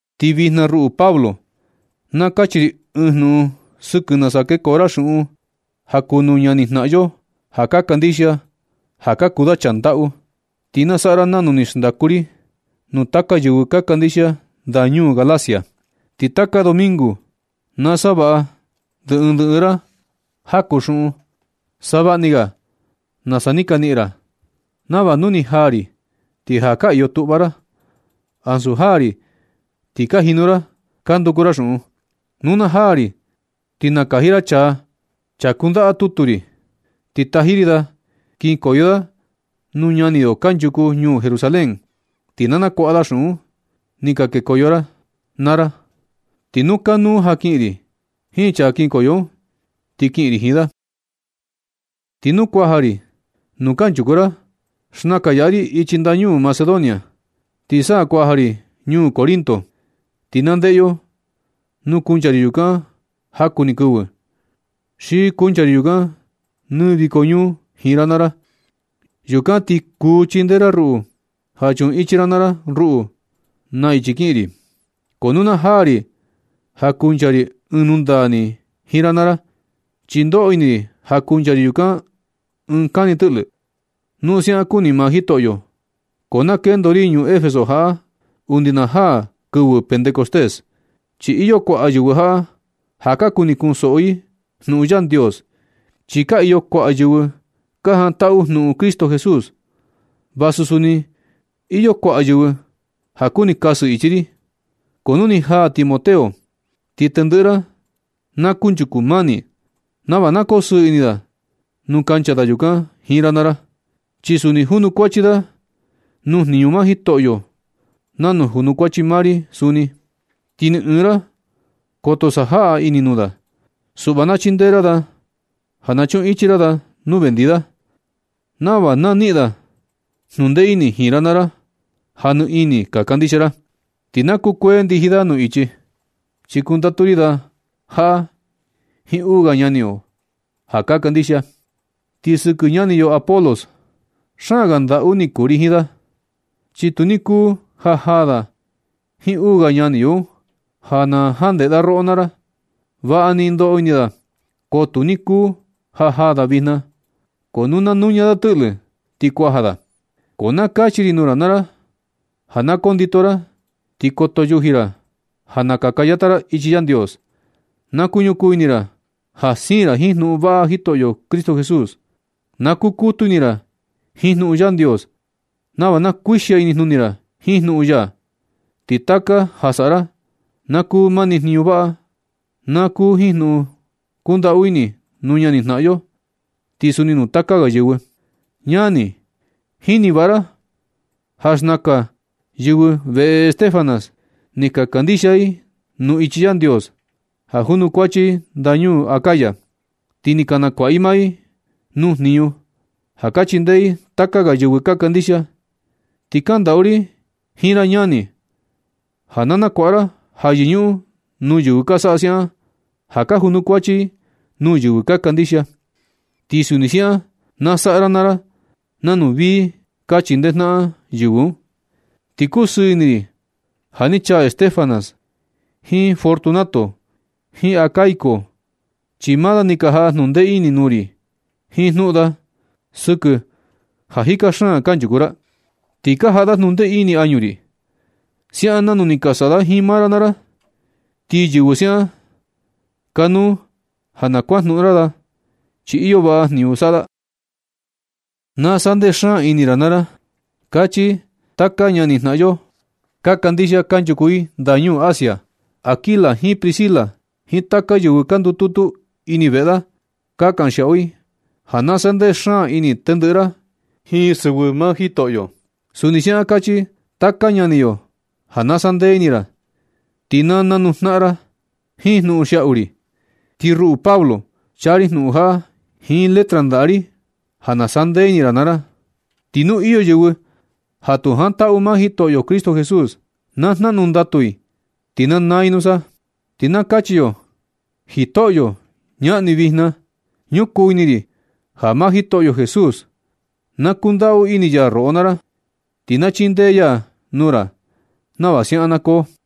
Ti vijna, ruꞌu Pablo, na kachi ri ɨɨn jnuꞌun sɨkɨ nasa kekoo ra xuꞌun ja kuu nuu ñanijnaꞌan yo ja ka kandixia, ja ka kuu da chaa ndaꞌu. Ti na saꞌa ra nanu ni xndaku ri nuu taka yɨvɨ ka kandixia ndañuu Galacia. Ti taka domingo na savaꞌa ndɨ ɨɨn ndɨ ɨɨn ra jaku xuꞌun, savaꞌa ni ga nasa ni ka niꞌin ra, nava nu na jaa ri ti ja ka iyo tuꞌva ra, ansu jaa ri ti ka jinu ra ka nduku ra xuꞌun. Nu na jaa ri ti nakaji ra chaa, chaa kundaꞌa tutu ri, ti taji ri da kinkoyo da nuu ñani yo kanchuku ñuu Jerusalén. Ti na nakuaꞌa da xuꞌun ni ka kekoo ra naa ra un. Ti nu kanuu ja kiꞌin ri jiin chaa kinkoyo un, ti kiꞌin ri jiin da. Ti nu kuaja ri nuu kanchuku ra, xnakan yaꞌa ri ichi ndañuu Macedonia, ti sa kuaja ri ñuu Corinto. Ti na ndeꞌe yo nu kuncha ri yukan jaku ni kɨvɨ, xi kuncha ri yukan nɨ viko ñuu jiin ra naa ra. Yukan ti kuu chindee ra ruꞌu ja chuꞌun ichi ra naa ra ruꞌu nuu ichi kiꞌin ri. Ko tu jaa ri ja kuncha ri ɨɨn nundaa ni jiin ra naa ra, chi ndoꞌo ini ri ja kuncha ri yukan ɨɨn kani tɨꞌlɨ, nu siaꞌan kuni maa Jitoꞌyo. Ko na kendo ri ñuu Efeso jaꞌa undi na jaa kɨvɨ Pentecostés, chi iyo kuaꞌa yɨvɨ jaꞌa ja ka kuni kunsoꞌo i jnuꞌun Yandios, chi ka iyo kuaꞌa yɨvɨ ka jantaꞌu jnuꞌun Cristo Jesús. Vasu suni iyo kuaꞌa yɨvɨ ja kuni kasɨ ichi ri. Ko nu ni jaa Timoteo, ti tendɨꞌɨ ra na kunchuku mani nava na kosɨɨ ini da nuu kancha da yukan jiin ra naa ra, chi suni junukuachi da nuu jniñu maa Jitoꞌyo nanu junukuachi maa ri suni. Ti ni ɨɨn ra koto sajaꞌa ini nuu da. Suꞌva na chindee ra da ja na chuꞌun ichi ra da nu vendi da, nava na niꞌin da jnundee ini jiin ra naa ra ja nɨ ini ka kandixia ra. Ti na kukuee ndiji da nuu ichi, chi kundatu ri da jaꞌa jiin uu ga ñani yo ja ka kandixia. Ti sɨkɨ ñani yo Apolos, xaan ga ndaꞌu ni kuu ri jiin da, chi tu ni kuu ja jaa da jiin uu ga ñani yo un, ja na jandeꞌe da roꞌo naa ra. Vaꞌa ni ndoꞌo ini da, ko tu ni kuu ja jaa da vijna. Ko nu na nuña da tɨꞌlɨ, ti kuaja da. Ko na kachi ri nuu ra naa ra ja na kondito ra, ti koto yuji ra ja na kaka yata ra ichi Yandios. Na kuñukuu ni ini ra ja siin ra jiin jnuꞌun vaꞌa Jitoꞌyo Cristo Jesús. Na kukutu ini ra jiin jnuꞌun Yandios nava na kuixia inijnuni ra jiin jnuꞌun ya. Ti taka ja saꞌa ra, na kuu mani jniñu vaꞌa. Na kuu jiin jnuꞌun kundaꞌu ini nuu ñanijnaꞌan yo, ti suni nuu taka ga yɨvɨ. Ñani, ka jini vaꞌa ra ja xnakan yɨvɨ veꞌe Estéfanas ni ka kandixia i nuu ichi Yandios, ja kanchuku i ndañuu Acaya. Ti ni ka nakuaꞌa i maa i nuu jniñu ja ka chindee i taka ga yɨvɨ ka kandixia. Ti kandaꞌu ri jiin ra ñani, ja na kuaꞌa ra ja yɨñuꞌun nuu yɨvɨ ka saꞌa siaꞌan, ja ka junukuachi i nuu yɨvɨ ka kandixia. Ti suni siaꞌan na saꞌa ra naa ra nanu vii ka chindee jnaꞌan yɨvɨ un. Ti kusɨɨ ini ri ja ni chaa Estéfanas jiin Fortunato jiin Acaico, chi maa da ni ka jaꞌa jnundee ini nuu ri jiin jnuꞌun da sɨkɨ ja jika xaan kanchuku ra. Ni ka jaꞌa da jnundee ini añu ri, siaꞌan nanu ni ka saꞌa da jiin maa ra naa ra. Ti yɨvɨ siaꞌan, kanuu ja na kuajnuꞌun ra da, chi iyo vaꞌa jniñu saꞌa da. Na sandee xaan ini ra naa ra, kachi taka ñanijnaꞌan yo ka kandixia ja kanchuku i ndañuu Asia. Aquila jiin Priscila jiin taka yɨvɨ ka ndututu ini veꞌe da, ka kanxiaꞌu i ja na sandee xaan ini tendɨꞌɨ ra jiin sɨvɨ maa Jitoꞌyo. Suni siaꞌan kachi taka ñani yo ja na sandee ini ra, ti na nanuu jnaꞌan naa ra jiin jnuꞌun xiaꞌu ri. Ti ruꞌu Pablo, chaa ri jnuꞌun jaꞌa jiin letra ndaꞌa ri ja na sandee ini ra naa ra. Ti nu iyo yɨvɨ ja tu jantaꞌu maa Jitoꞌyo Cristo Jesús, na jnaꞌnu ndatu i ti na naa i nusa. Ti na kachi yo: ¡Jitoꞌyo, ñaꞌan ni vijna! Ñukuu ini ri ja maa Jitoꞌyo Jesús, na kundaꞌu ini ya roꞌo naa ra, ti na chindee ya nuu ra nava siaꞌan na koo.